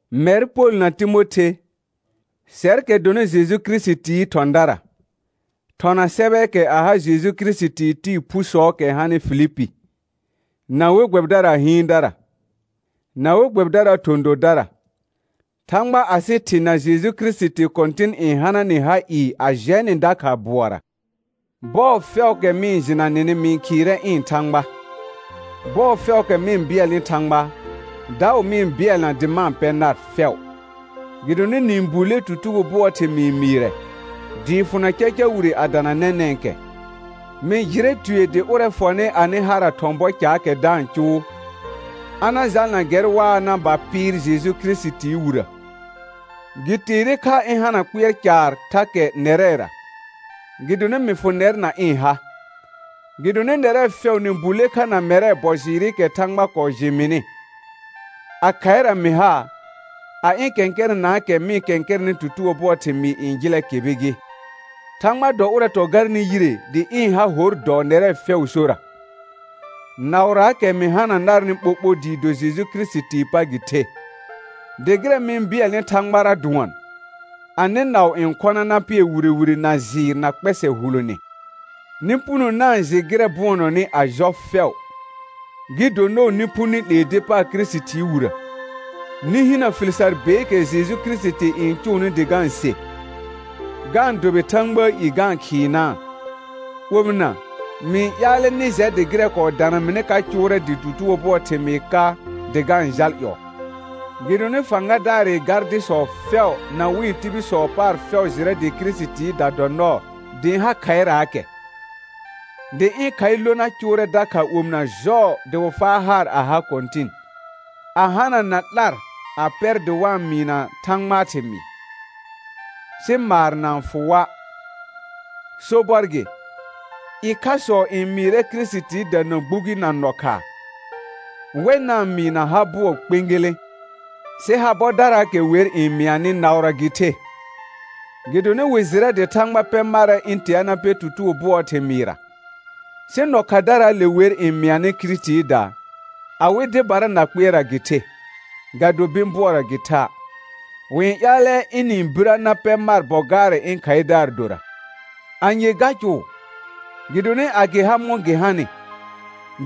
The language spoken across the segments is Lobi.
Mɛr Pol na Timothe, sɛrkɛ dɔnɩ Jeju Kirisitii thɔ̃dara, thɔna sɛbɛɛkɛ a ha Jeju Kirisitii tɩɩ phusɔɔkɛ hanɩ Filipi, na we gbɛbɩdaraa hɩɩndara, na we gbɛbɩdaraa thɔ̃ dodara. Thãgba asɩ Thɩ na Jeju Kirisiti Kɔ̃tɩn n hana nɩ ha ɩɩ a jɛ nɩ dakha bʋɔra. Bɔɔ fɛʋʋkɛ ma-n jɩna nɩnɩ mɩ-n khɩɩrɛ ɩ̃ Thãgba. Bɔɔ fɛʋʋkɛ mɩ-n bɩɛlnɩ Thãgba, daʋ mɩ-n bɩɛlna dɩ ma-n pɛ nar fɛʋ. Gɩdonɩ nɩ-n bulle tutugo bʋɔɔ thɩmɩɩ mɩɩrɛ, dɩɩ fʋna caca wire a dana nɛnɛ̃kɛ. Mɩ jɩrɛ tue dɩ ʋrɛ fɔnɩ anɩ hara thɔ̃ bɔ caakɛ da-n cʋʋ, a na jalna gɛr waa na ba pɩɩr Jeju Kirisitii wirə. Gɩ teere kha ɩ̃ hana kpɩɛr caar thakɛ nɛrɛra, gɩdonɩ mɩ fʋ nɛr na ɩ̃ ha, gɩdonɩ nɛrɛ fɛʋ nɩ bulle kha na mɛrɛ bɔ jɩɩrɩkɛ Thãgba kɔɔ jɩ mɩnɩ, a khaɩra mɩ ha, a ɩ̃ kɛ̃kɛrɛnaakɛ mɩ-n kɛ̃kɛrɛnɩ tutugo bʋɔɔ thɩmɩɩ n jɩlɛ kɩbɩ gɩ. Thãgba dɔ ʋrɛ tɔ garnɩ yire dɩ ɩ̃ ha hor dɔɔ nɛrɛ fɛʋʋ sora, naʋraakɛ mɩ hana narnɩ ɓoɓo dɩɩ do Jeju Kirisitii pa gɩ the. Dɩ gɩrɛ mɩ-n bɩɛlnɩ Thãgbara dʋɔn, anɩ naʋ n khɔna na pɩɛr wire wire na jɩɩr na kpɛsɛ hulone, nɩ puno na-n jɩ gɩrɛ bʋɔnɔnɩ a jɔ fɛʋ, gɩ do nɔɔ nɩ phu nɩ 'lee dɩ paar Kirisitii wirə; nɩ hinə fɩl sar beekɛ Jeju Kirisiti n cʋʋnɩ dɩ ga-n se, ga-n dʋbɩ Thãgbaa i ga-n khɩɩnaa. Omɩna, mɩ ƴaalɛ nɩ jɛ dɩ gɩrɛ kɔɔ dana mɩnɩ ka cʋʋrɛ dɩ tutugo bʋɔɔ thɩmɩɩ ka dɩ ga-n jal ƴɔɔ. Gɩdonɩ fãgadaarɩ gardɩsɔ fɛʋ na wɩ̃ tibilsɔ paar fɛʋ jɩrɛ dɩ Kirisitiida dɔ nɔɔ dɩ ɩ̃ ha khaɩraakɛ. Dɩ ɩ̃ khaɩ lona cʋʋrɛ dakha omɩna jɔɔ dɩ wɩ faa haar a ha Kɔ̃tɩn, a hanana 'lar a pɛr dɩ wa-n mɩɩna Thãgbaa thɩmɩɩ, sɩ maar na-n fʋ wa'. Sobɔr gɩ, ɩkhasɔ n mɩɩrɛ Kirisitiida na gbugi na nɔkhaa, wɛ na-n mɩɩ na ha bʋɔ kpẽgelẽ; sɩ ha bɔdaraakɛ wer n mɩanɩ naʋra gɩ the, gɩdonɩ wɩ jɩrɛ dɩ Thãgba pɛ marɛ ɩ̃ tea na pɛ tutugo bʋɔɔ thɩmɩɩra. Sɩ nɔkhadaraale wer n mɩanɩ Kirisitiida, awɩ dɩbara na kpɩɛrra gɩ the, ga do bɩ̃ bʋɔra gɩ tha'. Wɩ-n ƴaalɛ ɩnɩ-n birə na pɛ mar bɔ gaarɛ ɩ̃ khaɩdaar dora. Anye ga cʋʋ? Gɩdonɩ a gɩ ha mɔ̃ gɩ hanɩ,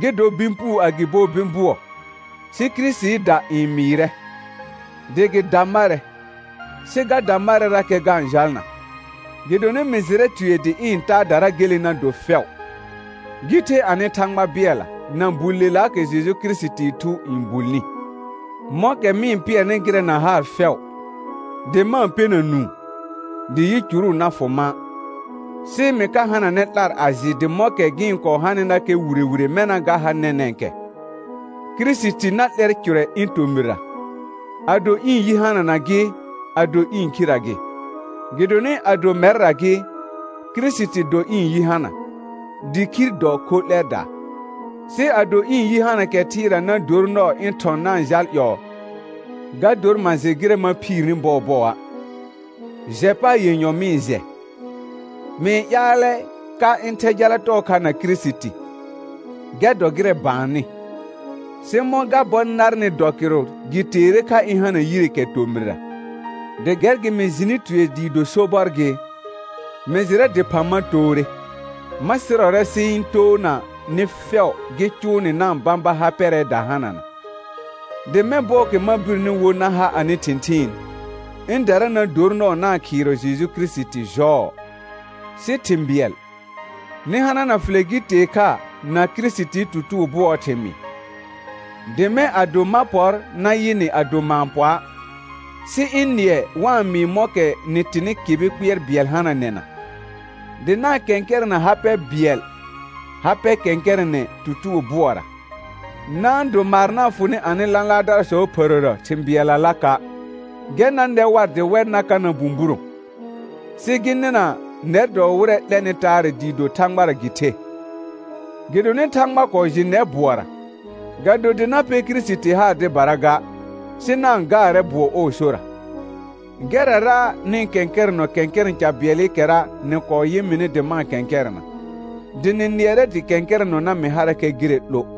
gɩ dɔ bɩ̃ puu agɩbo bɩ̃ bʋɔ, sɩ Kirisitiida n mɩɩrɛ, dɩ gɩ da marɛ, sɩ ga da marɛrakɛ ga-n jalna. Gɩdonɩ mɩ jɩrɛ tue dɩ ɩ̃ taadara gele na do fɛʋ, gɩ the anɩ Thãgba bɩɛlla, na bullelaakɛ Jeju Kirisitii Thu n bulni, mɔ̃kɛ mɩ-n pɩɛrnɩ gɩrɛ na haar fɛʋ, dɩ ma-n pɛna nũu, dɩ yicuru na fʋ ma', sɩ mɩ ka hananɛ 'lar a jɩ dɩ mɔ̃kɛ gɩ-n kɔɔ hanɩnakɛ wire wire mɛna ga ha nɛnɛ̃kɛ, Kirisiti na 'lɛr cʋrɛ ɩ̃ tomɩra, ado ɩ̃ yi hanana gɩ, ado ɩ̃ khirə gɩ. Gɩdonɩ ado mɛrra gɩ, Kirisiti dɔ ɩ̃ yi hana, dɩ khir dɔ khor 'lɛdaa. Sɩ ado ɩ̃ yi hana kɛ thɩɩra na dor nɔɔ ɩ̃ thɔ̃ na-n jal ƴɔɔ, ga dor ma jɩ gɩrɛ ma phiirni bɔɔbɔa'. Jɛ paar yenyɔ mɩ-n jɛ: Mɩ-n ƴaalɛ ka ɩ̃ thɛ jala tɔɔ kha na Kirisiti, gɛr dɔ gɩrɛ baannɩ; sɩ mɔ̃ ga bɔ narnɩ dɔ kɩrʋ gɩ teere kha ɩ̃ hana yire kɛ tomɩrra. Dɩ gɛr gɩ mɩ jɩnɩ tue dɩɩ do sobɔr gɩ, mɩ jɩrɛ dɩphã ma toore, ma sɩrɔrɛ sɩ ɩ̃ toona nɩ fɛʋ gɩ cʋʋ nɩ na-n bãba ha pɛrɛɛ da hanana; dɩ mɛ̃ bɔɔkɛ ma birni wo na ha anɩ thɩ̃thɩɩn, ɩ̃dara na dor nɔɔ na-n khɩɩrɔ Jeju Kirisiti jɔɔ. Sɩ thɩ̃ bɩɛl, nɩ hanana fɩlɛ gɩ tee kha na Kirisitii tutugo bʋɔɔ thɩmɩɩ, dɩ mɛ̃ ado ma pɔr na yɩ nɩ ado ma-n pɔa', sɩ ɩ̃ nɩɛ wa-n mɩɩ mɔ̃kɛ nɩ tɩnɩ kɩbɩ kpɩɛr bɩɛl hananɛna, dɩ na-n kɛ̃kɛrɛ̃ na ha bɩɛl ha pɛ kɛ̃kɛrɛnɛ tutugo bʋɔra. Na-n do maar na-n fʋ nɩ anɩ lãlaardarasɔɔ phərəra thɩ̃ bɩɛllalaka', gɛr na nɛ war dɩ wɛr na ka na bũburõ, sɩ gɩ nɩna nɛr dɔ wɩrɛ 'lɛnɩ taarɛ dɩɩ do Thãgbara gɩ the. Gɩdonɩ Thãgba kɔɔ jɩ nɛr bʋɔra, ga do dɩ na pɛ Kirisiti haar dɩbara ga, sɩ na-n gaarɛ bʋɔ ɔɔ sora. Gɛrrara nɩ-n kɛ̃kɛrɛnɔ kɛ̃kɛrɛ̃ ca bɩɛlɩkɛra nɩ kɔɔ yɩ mɩnɩ dɩ ma-n kɛ̃kɛrɛna, dɩ nɩ nɩɛrɛ dɩ kɛ̃kɛrɛnɔna mɩ harakɛ gɩrɛ 'lo.